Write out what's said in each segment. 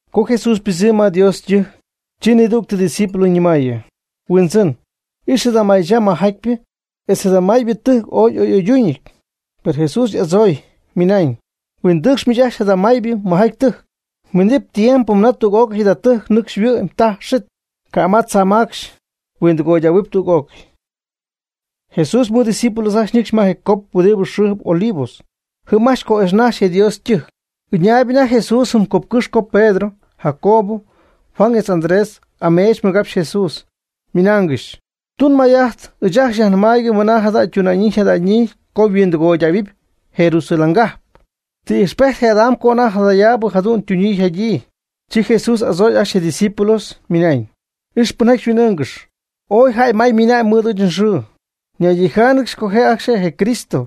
Co Jesús ypɨdzɨmy ma Dios ytɨjc, chi nidügtɨ ydiscípulos ñɨmayɨ: ―Huindzɨn, ix jada maychaa mɨjjatypɨ etz jada maybɨ tɨjc ooy y'oy'oydúñɨty. Per Jesús y'adzooy, ymɨnañ: ―Huindɨcx miich ajcxy jada maybɨ mɨjjaty ytɨjc. Minɨp tiempo mɨna tüg'ócɨy jada tɨjc nɨcxy yhuɨ'my taj xit, ca' ma tzaa macxy. Huindɨgoydähuɨp tüg'ócɨy. Jesús mɨɨd ydiscípulos ajcxy ñɨcxy ma je cop huɨdibɨ xɨɨjɨp Olivos. Jɨm ajcxy co'ijxnaxy je Dios ytɨjc. Ɨñaayb anajty Jesús jɨm copcɨ́xy co Pedro, Jacob, Juan etz Andrés ameech mɨgapxy Jesús, ymɨnaangɨxy: ―Tun may'ajt ɨɨch ajcxy yajnɨmaayg mɨna jada ytuna'ñyii yjada'ñyii co huindɨgoydähuɨp Jerusalén cajp. ¿Ti ijxpejt'adam co anajty jadayaabɨ jadu'n ytuna'ñyii yjada'ñyii? Chi Jesús y'adzooy ajcxy je' ydiscípulos ymɨnañ: ―Ix pɨnjaty xyhuin'ɨɨngɨxy. Ooy jäy may ymiinañ mɨɨd ɨɨch nxɨɨ. Ñaydijáanɨgɨxy co je' ajcxy je' je Cristo,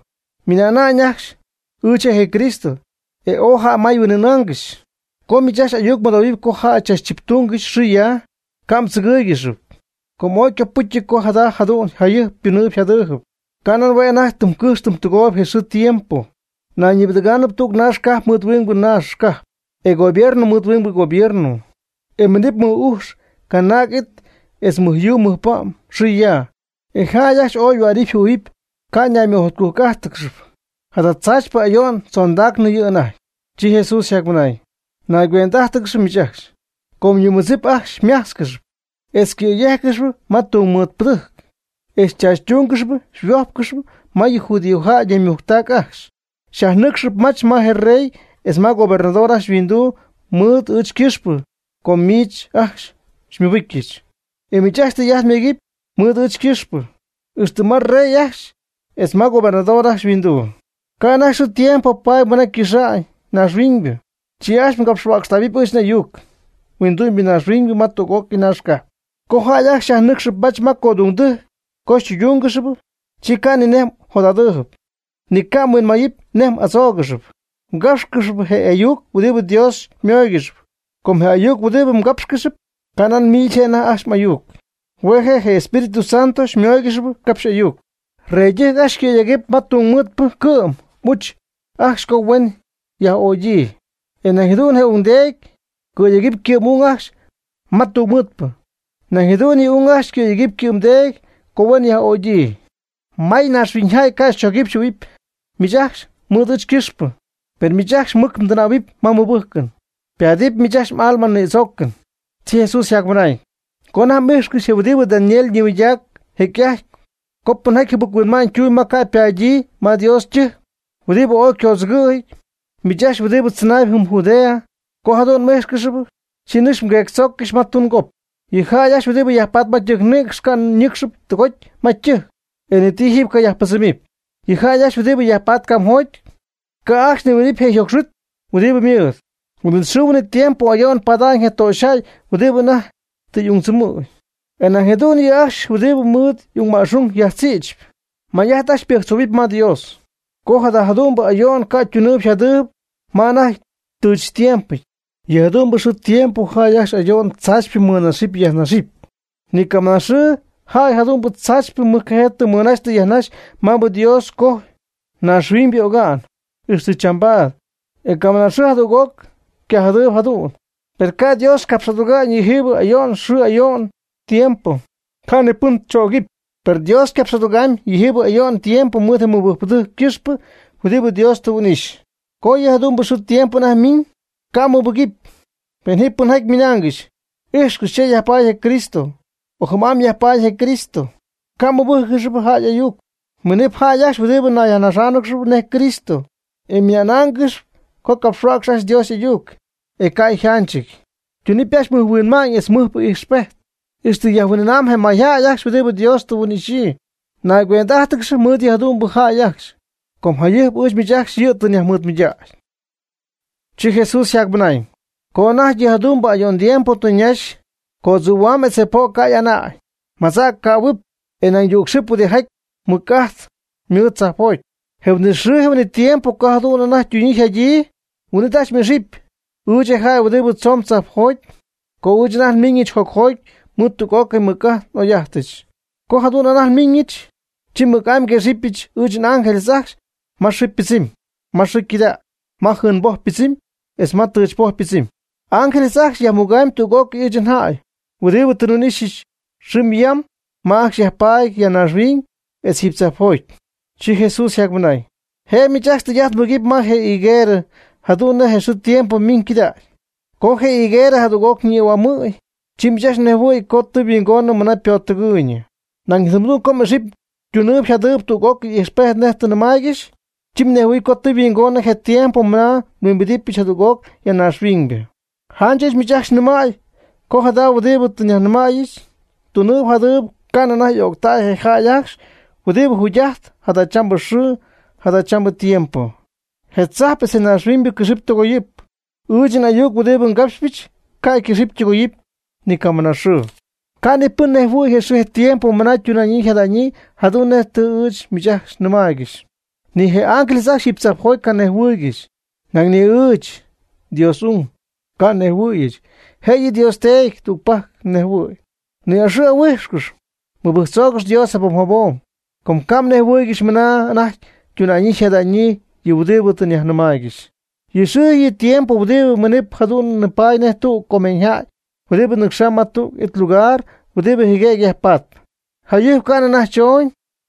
ymɨna'na'ñ ajcxy: “Ɨɨch je' je Cristo.” E ooy jäy may huin'ɨɨnaangɨxy. Co miich ajcxy ayuc mmɨdohuɨpy co jäy chachchiptúngɨxy xɨɨ ya, ca' mdzɨgɨ́ɨygɨxɨp, com ooy ycopɨ́cyɨty co jada jadu'n jayɨjp ytunɨɨyb yjadɨɨyb. Ca' nan hue' je' anajty tɨm cɨjxp tɨm tɨgooyb je xɨɨ je tiempo. Nayñibɨdɨ̈gɨɨb tüg naax cajp mɨɨd huingbɨ naax cajp, e gobierno mɨɨd huingbɨ gobierno. E minɨpy mɨc ujx canaag'it etz mɨj yuu mɨjpa'm xɨɨ ya. E jäy ajcxy ooy yhuänɨpy yjɨhuɨ̈huɨpy ycanaymɨjotcujc'ájtɨgɨxɨpy. Jada tzaachypɨ ayo'n tzondacnɨ yɨ' anajty. Chi Jesús yjacmɨnañ: ―Nayguend'ájtɨgɨx miich ajcxy, com yɨ mmɨdzip ajcxy xymájtzcɨxɨp, e xycɨ̈yéjccɨxɨp ma tungmɨɨdpɨdɨjc, e xychachytúngɨxɨp xyhuójpcɨxɨp ma yɨ judíojäy ñaymujctac ajcxy. Xyajnɨ́cxcɨxɨp mach ma rey etz ma gobernador ajcxy yhuinduu mɨɨd ɨɨch ycɨxpɨ com miich ajcxy xymɨbɨcyɨch. E miich ajcxy tɨy'ajt myegɨpy mɨɨd ɨɨch ycɨxpɨ, ixtɨ ma rey ajcxy etz ma gobernador ajcxy yhuinduu. Ca' anajty xɨɨ tiempo paady mɨna ycɨxa'ñ naaxhuiñybɨ, chi ajcxy capxhuäcxtähuɨpy ɨɨch n'ayuc huindu'myb ñaaxhuiñ ma tüg'ócɨy naax cajp. Co jäy ajcxy xyajnɨ́cxɨp mach ma codungdɨjc co xytɨydúngɨxɨpy, chi ca' ni nej mjot'adɨɨyb, ni ca' mhuinmayɨpy nej m'adzóogɨxɨpy. Mgápxcɨxɨpy je ayuc huɨdibɨ Dios xymóoygɨxɨpy, com je ayuc huɨdibɨ mgápxcɨxɨp, ca' nan miich je' anajty ajcxy m'ayuc. Hue' je' je Espíritu Santo xymóoygɨxɨpy capxy ayuc. Yëydɨjc ajcxy ycɨ̈yegamyb ma tungmɨɨdpɨ ycɨ'm y'uch ajcxy co huen yaj'ögyii. E nañ jadu'n je ungdeedy ycɨ̈yegamy ycɨ'm y'ung ajcxy ma tungmɨɨdpɨ. Nañ jadu'n yɨ' y'ung ajcxy cɨ̈yegɨpy ycɨ'mdeedy co huen yaj'ögyii. May naaxhuiñjäy ca' xychogɨpy xyjɨhuɨ̈huɨpy miich ajcxy mɨɨd ɨɨch ycɨxpɨ. Pen miich ajcxy mmɨctɨnaayb ma mmɨbɨ́jcɨn, ypaadɨp miich ajcxy m'alma nïdzoocɨn. Chi Jesús yjacmɨnañ: ―Co anajty m'íjxcɨxy je huɨdibɨ Daniel ñimɨydac jecy'ajty, co pɨnjaty jɨbɨc-huinma'ñ tumb ma ca' ypadyii ma Dios ytɨjc, huɨdibɨ ooy ycodzɨgɨ̈jɨty. Miich ajcxy huɨdibɨ tzɨnaayb jɨm Judea, co jadu'n m'íjxcɨxɨpy, chi nɨcx mgueectzooccɨx ma tungop. Yɨ jäy ajcxy huɨdibɨ yajpatp ma ytɨjcnïcxy ca' ñɨ́cxɨty tɨgoty ma ytɨjc. E ni ti jiiby cayajpɨdzɨmɨpy. Yɨ jäy ajcxy huɨdibɨ yajpatp camjoty, ca' ajcxy nihuimbidɨpy je' yjocxy huit huɨdibɨ ymɨɨd. Huin'it xɨɨ huin'it tiempo ayo'n pada'ñ je töxyjäy huɨdibɨ anajty tɨ y'ungtzɨmɨ̈gy, e nañ jadu'n yɨ' ajcxy huɨdib mɨɨd y'ung ma'xung yajtzïtzp. May'ajt ajcxy mbɨjctzoohuɨpy ma Dios, co jada jadu'mbɨ ayo'n ca' ytunɨɨyb yjadɨɨyb ma anajty ytɨɨch tiémpɨty. Yɨ jadu'mbɨ xɨɨ tiempo jäy ajcxy ayo'n tzaachypɨ mɨnaxɨpy yajnaxɨpy. Ni camɨnaaxɨɨ jäy jadu'n tzaachypɨ mɨjcajee tɨ mɨnaxy tɨ yajnaxy maabɨ Dios cojy naaxhuiñybɨ oga'n, ixtɨ chambaad. E camɨnaxɨɨ jadüg'oc ycajadɨɨyb jadu'n. Pen ca' Dios capx'aduga'ñ yɨjiibɨ ayo'n xɨɨ ayo'n tiempo, ca' ni pɨn chögɨpy. Per Dios ycapx'adugamyb yɨjiibɨ ayo'n tiempo mɨɨd je mɨbɨjcpɨdɨjc ycɨxpɨ huɨdibɨ Dios tɨ huin'ixy. Co yɨ jadu'mbɨ xɨɨ tiempo anajty ymiiñ, ca' mmɨbɨgɨpy, pen ji pɨnjaty xyñɨmaaygɨxy: “Ijxcɨx, cha yajpaady je Cristo”, o “jɨm'amy yajpaady je Cristo.” Ca' mmɨbɨ́jccɨxɨpy jäy y'ayuc. Minɨp jäy ajcxy huɨdibɨ ñayyajnaxáanɨgɨxy nej Cristo, e ymɨnáangɨxɨpy co capxhuäcxy ajcxy Dios y'ayuc, e ca' yjánchɨty. Ytunɨpy ajcxy mɨj huinma'ñ etz mɨjpɨ ijxpejt, ixtɨ jahuin'ɨɨna'ñ je mayjäy ajcxy huɨdibɨ Dios tɨ yhuin'ixyii. Nayquend'ájtɨgɨx mɨɨd yɨ jadu'mbɨ jäy ajcxy, com jayɨjp ɨɨch miich ajcxy yɨ' tɨ nyajmɨɨdmɨydägy. Chi Jesús yjacmɨnañ: ―Co anajty yɨ jadu'mbɨ ayo'n tiempo tɨ ñaxy, ycoodzɨ̈hua'ñ etz je po' ca' y'ana'ñ. Maymadza' ycähuɨp, e nañ yücxɨp huɨdijaty mɨc'ajt mɨɨd tzajpjoty. Je huin'it xɨɨ je huin'it tiempo co jadu'n anajty ytunyii yjadyii, huin'it ajcxy m'ixɨpy, ɨɨch je jäy huɨdibɨ tzoon tzajpjoty, co ɨɨch anajty nmiiñɨch jocjoty mɨɨd tüg'ócɨy nmɨc'ajt n'oy'ajtɨch. Co jadu'n anajty nmiiñɨch, chi mɨc'amy nguexɨpyɨch ɨɨch n'ángeles ajcxy ma xɨɨ ypɨdzɨmy, ma xɨɨ ycɨdägy, ma jɨɨmboj ypɨdzɨmy etz ma tɨchpoj ypɨdzɨmy. N'ángeles ajcxy yajmuga'ñ tüg'ócɨy ɨɨch njäy, huɨdibɨ tɨ nhuin'ixyɨch, xɨm yam ma ajcxy yajpaady ya naaxhuiñ, etz jiiby tzajpjoty. Chi Jesús yjacmɨnañ: ―Jëb miich ajcxy tɨy'ajt mbɨgɨpy ma yɨ higuerɨ jadu'n nej je xɨɨ je tiempo mimb cɨdaacnɨ. Co je hɨguerɨ jadüg'oc ñïhuamɨ̈y, chi miich ajcxy mnejhuɨ̈y co tɨ yhuingonɨ mɨna ypottɨgɨɨyñɨ. Nañ tɨm jadu'n co m'ixɨpy tunɨɨyb yjadɨɨyb tüg'ócɨy ijxpejt nej tɨ nnɨmaaygɨxy, chi mnejhuɨ̈huɨp co tɨ yhuingonɨ je tiempo mɨna nhuimbidɨpyɨch jadüg'oc ya naaxhuiñybɨ. Janch ɨɨch miich ajcxy nɨmäy co jada huɨdibɨ tɨ nnimɨydacyɨch tunɨɨb jadɨɨb ca'nɨ anajty y'öctay je jäy ajcxy huɨdibɨ jacjugy'ajtp jadachambɨ xɨɨ jadachambɨ tiempo. Je tzajp etz je naaxhuiñybɨ cɨxɨpy tɨgoyɨpy. Ɨɨch n'ayuc huɨdibɨ ngapxyɨch, ca' ycɨxɨpy ytɨgoyɨpy ni camɨnaxɨɨ. Ca' ni pɨn nejhuɨ̈y je xɨɨ je tiempo mɨna ytuna'ñyii yjada'ñyii jadu'n nej tɨ ɨɨch miich ajcxy nnɨmaaygɨxy. Ni je ángeles ajcxy jiiby tzajpjoty ca' nejhuɨɨygɨxy, nañ ni ɨɨch, Dios y'ung', ca' nejhuɨ̈yɨch. Jëyɨ Dios Teedy tügpajc nejhuɨ̈y. Ni'ixɨ' ahuíjxcɨx. Mɨbɨjctzoogɨx Dios jabom jabom, com ca' mnejhuɨɨygɨxy mɨna anajty ytuna'ñyii yjada'ñyii yɨ huɨdibɨ tɨ nyajnɨmaaygɨxy. Yɨ xɨɨ yɨ tiempo huɨdibɨ minɨp jadu'n nipaady nej tüg comeeñyjäy huɨdibɨ ñɨcxa'ñ ma tüg it lugar huɨdibɨ jɨgüegy yajpatp. Jayɨjp ca'nɨ anajty chooñ,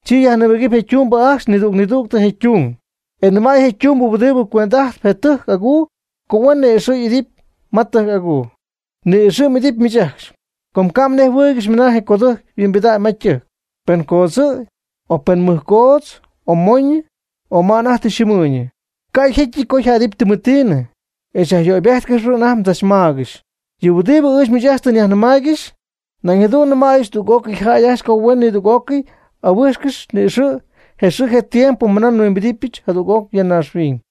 chi yajnïbɨjcy je ytumbɨ ajcxy nidüg nidüg je' ytung. E nɨmay je' ytumbɨ huɨdibɨ cuend'ajtp je tɨjc'aguu co huen ni'ixɨ' y'idɨpy ma tɨjc aguu. Ni'ixɨ' m'idɨpy miich ajcxy. Com ca' mnejhuɨɨygɨxy mɨna je codɨjc yhuimbida'ñ ma ytɨjc, pen namgodzɨ̈y, o mɨj coodz, o moñɨ, o ma anajty tɨ yxɨɨmɨɨyñɨ. Ca' jécyɨty co yjädɨpy tɨmetiinɨ, e xyajyöybéjtcɨxɨpy anajty mdzachmaagɨxy. Yɨ huɨdibɨ ɨɨch miich ajcxy tɨ nyajnɨmaaygɨxy, nañ jadu'n nɨmäyɨch tüg'ócɨy jäy co huen ajcxy nidüg'ócɨy ahuíjxcɨxɨp ni'ixɨ' je xɨɨ je tiempo mɨna nhuimbidɨpɨch jadüg'oc ya naaxhuiñ.